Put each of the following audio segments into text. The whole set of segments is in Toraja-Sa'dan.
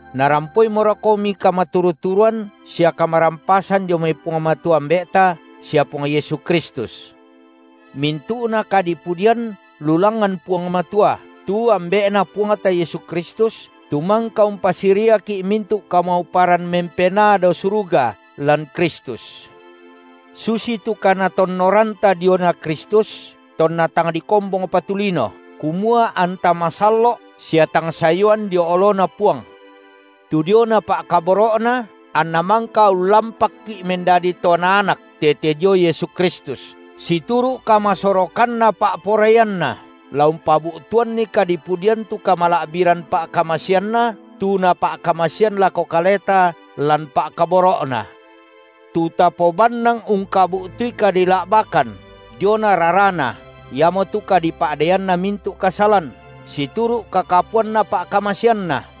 narampoimorokomi kamaturu-turuan sia kamarampasan dio mai Puang Matua Ambe’ta sia Puang Yesu Kristus. Mintu’na kadipudian lu langngan Puang Matua, tu Ambe’Na Puangta Yesu Kristus, tu mangka umpasiriaki’ mintu’ kamauparan mempenaa dao suruga lan Kristus. Susitu kaNatonnoranta diona Kristus, tonna tang dikombongpa tu lino, kumua anta masallo’ sia tang sayuan dio oloNa Puang. Tu diona pa’kaboro’Na anNa mangka ullampakki’ mendadi to Naanak tete dio Yesu Kristus, situru’ kamasorokanna pa’poraianNa, la umpabu’tuanni kadipudian tu kamala’biran pa’kamaseanNa, tu Napa’kamasean lako kaleta lan Pa’kaboro’Na. Tu tapobannang ungkabu’tui kadila’bakan diona raraNa iamotu kadipa’deianna mintu’ kasalan, situru’ kakapuanna pa’kamaseanNa,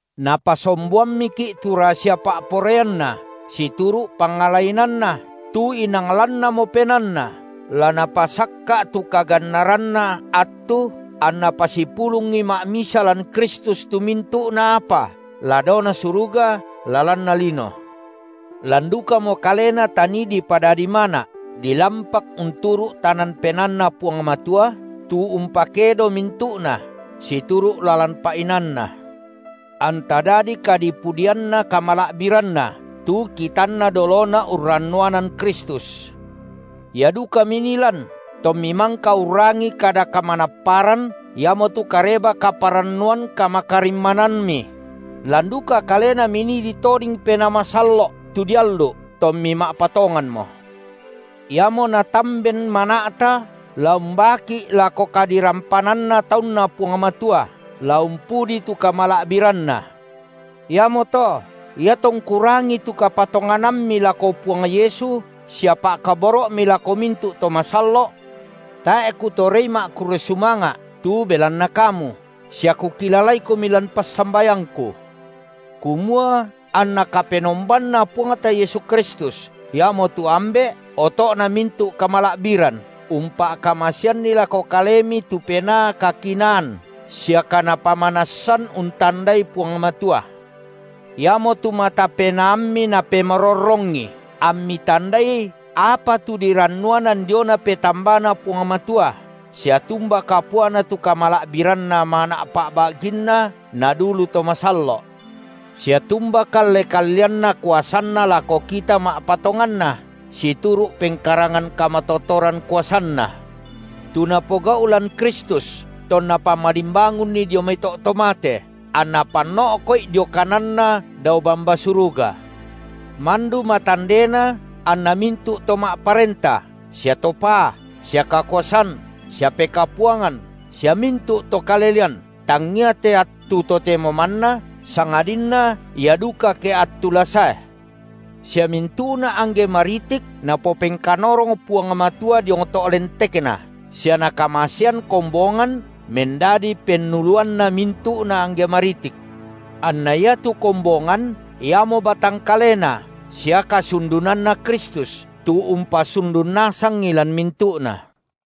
Napasomboammiki’ tu rasia pa’poraianNa situru’ pangala inaanNa, tu inang lannamo penaanNa, la Napasakka’ tu kagannaranna attu, anNa pasipulungi ma’misa lan Kristus tu mintu’na apa la daona suruga, la lanna lino. Lan dukamo Kalena tanii dipadadi mana’, dilampak unturu’ tanan penaanNa Puang Matua, tu umpakedo mintu’na, situru’ lalan pa’inaanNa. Anta dadi kadipudianna kamala’biranNa, tu kitanna dolona urrannuanan Kristus. Ia duka minii lan, tommi mangka urrangi kada kamanapparan iamotu Kareba-kaparannuan kamakarimmanammi; lan duka Kalena minii ditoding Penaa Masallo’ tu diallu’, tommi ma’patonganmo. Iamo natamben mana’ta la umbaaki’ lako kadirampananna taunNa Puang Matua, la umpudi tu kamala’biranNa. Iamoto iatongku rangii tu kapatonganammi lako Puang Yesu sia pa’kaboro’mi lako mintu’ to masallo’, tae’ kutorei ma’kurre sumanga’ tu belanna kamu, sia kukilalaikomi lan passambayangku, kumua anna KapenombanNa Puangta Yesu Kristus, iamotu Ambe’ oto’na mintu’ kamala’biran, umpa’kamaseanni lako kalemi tu Penaa kakinaan sia kaNapamanassan untandai Puang Matua. Iamotu mata penaammi Napemarorrongi, ammi tandai apa tu dirannuanan diona petambaNa Puang Matua sia tumba kapuana tu kamala’biranna mana’ pa’ba’ginNa nadulu to masallo’; sia tumba kalle-kalleanna kuasanNa lako kita ma’patonganna, situru’ pengkarangan kamatotoran kuasanNa, tu Napogau’ lan Kristus, tonna pamalimbangunNi dio mai to’ to mate, anNa panno’ko’I dio kananNa dao bamba suruga, mandu matandena anna mintu’ to ma’parenta sia to paa sia kakuasan sia pekapuangan sia mintu’ to kalelean, tangia te attu totemo manna, sangadinna ia duka ke attu la sae. Sia mintu’na angge maritik Napopengkanorong Puang Matua diong to’ lentekNa, sia Nakamasean kombongan mendadi pennuluanna mintu’na angge maritik. Anna iatu kombongan iamo batang kaleNa sia kasundunanNa Kristus, tu umpasundun nasangi lan mintu’na.